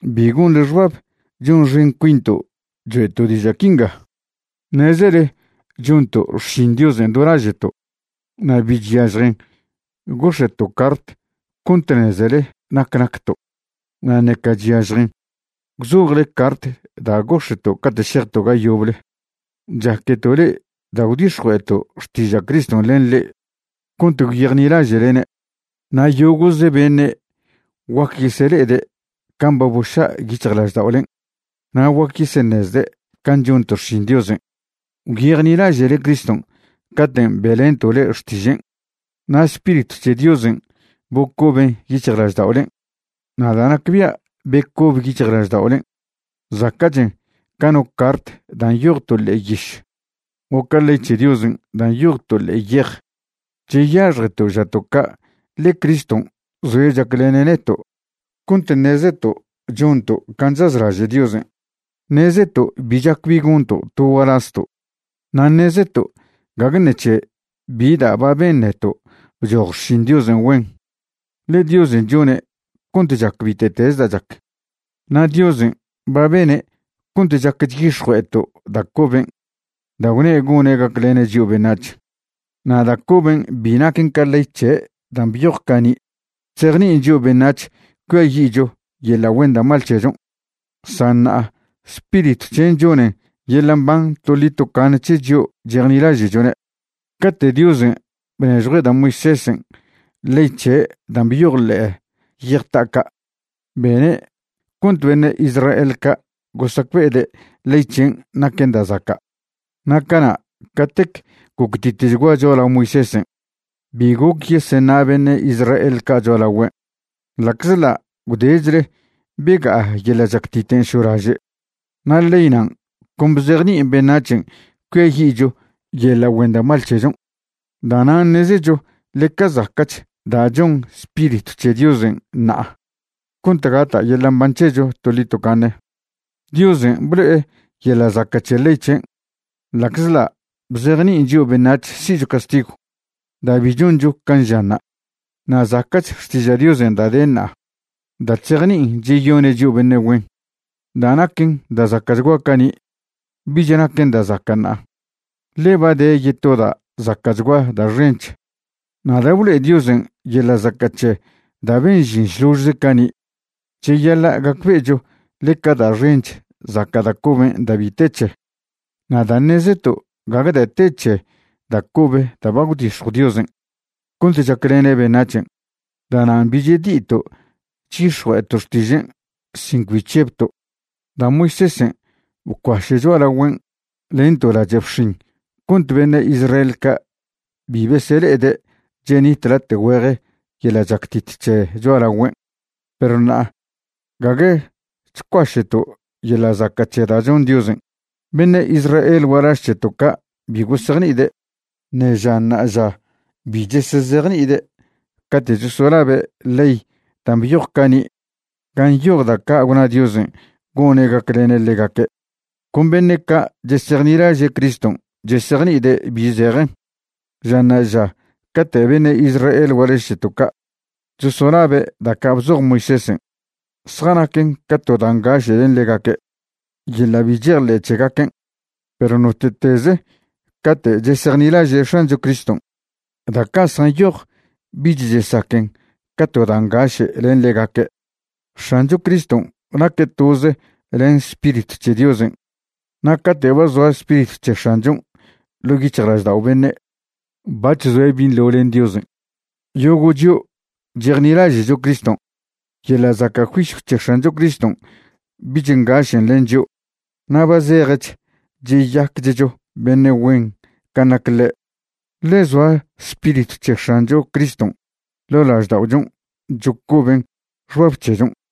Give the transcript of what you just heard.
Bi gonḻe xbab chonxen cuinto' choe'to' diža' quinga. Ṉezele chonto' xšin Diosen' do laže'to', na' bi chyažjen gox̱e'to' cart cont ṉezele nac nacto', na' ṉeca chyažjen gwzojle cart da' gox̱e'to' cate' šejto' ga yoble. Chaqueto' le'e da' gwdix̱jue'eto' xtiža' Criston' len le'e cont gwyejnilaže'lene'. Na' yogo'ze beṉe' guac yesele'ede' can' ba boša' yic̱hjlažda'olen' na' guac yeseṉezde' can' chonto' xšin Diosen'. Gwyejnilaže'le Criston' caten' be'lento' le'e xtižen', na' Spiritw c̱he Diosen' bocoben yic̱hjlažda'olen'. Na' da' nacbia' becobe yic̱hjlažda'olen' zaca'chen ca no cart da' nyoj to ḻe'e yiš o ca ley c̱he Diosen' da' nyoj to ḻe'e yej. Cheyaxjeto' žato' ca' ḻe Criston' zoe' chaclene' neto' cont ṉezeto' chonto' can' chazlaže' Diosen'. Ṉezeto' bi chac bi gonto' to gualazto', na' ṉezeto' gague ṉec̱he bi da' ba ben neto' bchoj xšin Diosen' güen, ḻe Diosen' chone' cont chac bite'teze da' chac. Na' Diosen' ba bene' cont chac chyix̱jue'eto' da' coben' da' gwne' gone' gaclene' chio' beṉac̱h. Na' da' coben' bi naquen ca ley c̱he' dan' byoj cani' chzejni'in chio' beṉac̱h cuiayi'cho yeḻa' güen da' mal c̱hechon', san ṉa'a Spiritw c̱hen' choṉen yeḻa' mban toḻi tocaṉe c̱he chio' chejnilaže'chone'. Cate' Diosen' bnežjue' da' Moisésen' ley c̱he' dan' byoj ḻe'e yej ta'a ca', bene' cont beṉe' Israel ca' gosacbe'ede' ley c̱hen' naquen da' zaca'. Na' cana' catec goctitechgua cho'alao Moisésen', bi goc yeseṉa' beṉe' Israel ca' cho'alagüen', ḻa'czḻa' gwdechle bega'a yeḻa' chactiten' šolaže'. Na' ley nan' con bzejni'in beṉac̱hen' cuiayi'cho yeḻa' güen da' mal c̱hechon'. Da'nan' ṉezecho ḻeca zaca'ch da' chon Spiritw c̱he Diosen' ṉa'a cont gata' yeḻa' mban c̱hecho toḻi tocaṉe. Diosen' blo'e yeḻa' zaca' c̱he ley c̱hen' ḻa'czḻa' bzejni'in chio' beṉac̱h si'cho castigw da' bi choncho can' žanṉa'. Na' zaca'ch xtiža' Diosen' da' de ṉa'a da' chzejni'in cheyone' chio' beṉe' güen. Da' naquen da' zaca'chgua cani', bic̱h naquen da' zaca' ṉa'a, ḻe ba de yeto da' zaca'chgua da' xench. Na' da' blo'e Diosen' yeḻa' zaca' c̱he da' ben žin šložze cani', cheyaḻa' gacbe'echo ḻeca da' xench zaca' da' coben' da' bi te c̱he. Na' da' ṉezeto' gague da' te c̱he da' cobe da' ba gwdix̱jw Diosen' cont chaclene' beṉac̱hen', da'nan' bi chedi'ito' chyix̱jue'eto' xtižen' sin cbi chžebto'. Da' Moisésen' bcuaše' cho'alagüen' len to lache' bxin cont beṉe' Israel ca' bi besele'ede' chenit late' güeje yeḻa' chactit c̱he cho'alagüen'. Perw ṉa'a gague chcuaše'to' yeḻa' zaca' c̱he da' chon Diosen'. Beṉe' Israel gualaž c̱heto' ca' bi gosejni'ide', ṉe ža ṉa'aža bi chesezejni'ide' cate' chosolabe' ley dan' byoj cani' gan' nyoj da' ca' gwna Diosen' gone' gaclene' ḻegaque'. Con beṉe' ca' chesejnilaže' Criston' chesejni'ide' bi zejen. Ža ṉa'aža cate' beṉe' Israel gualaž c̱heto' ca' chosolabe' da' ca' bzoj Moisésen', zjanaquen ca to da' ngaše' len ḻegaque' yeḻa' bi chejḻe' c̱hegaquen'. Perw note'teze' cate' chesejnilaže' X̱ancho Criston', da' ca' zjanyoj bich chesaquen ca to da' ngaše' len ḻegaque'. X̱ancho Criston' naque' toze len Spiritw c̱he Diosen'. Na' cate' ba zoa Spiritw c̱he X̱anchon' ḻo' yic̱hjlaždao' beṉe', bac̱h zoe' binḻo len Diosen'. Yogo' chio' chejnilaže'cho Criston', yeḻa' zaca' juisyw c̱he X̱ancho Criston' bich ngašen' len chio', na' ba zejech cheyaquechcho beṉe' güen can' nac ḻe', ḻe zoa Spiritw c̱he X̱ancho Criston' ḻo' lažda'ochon' chocoben xbab c̱hechon'.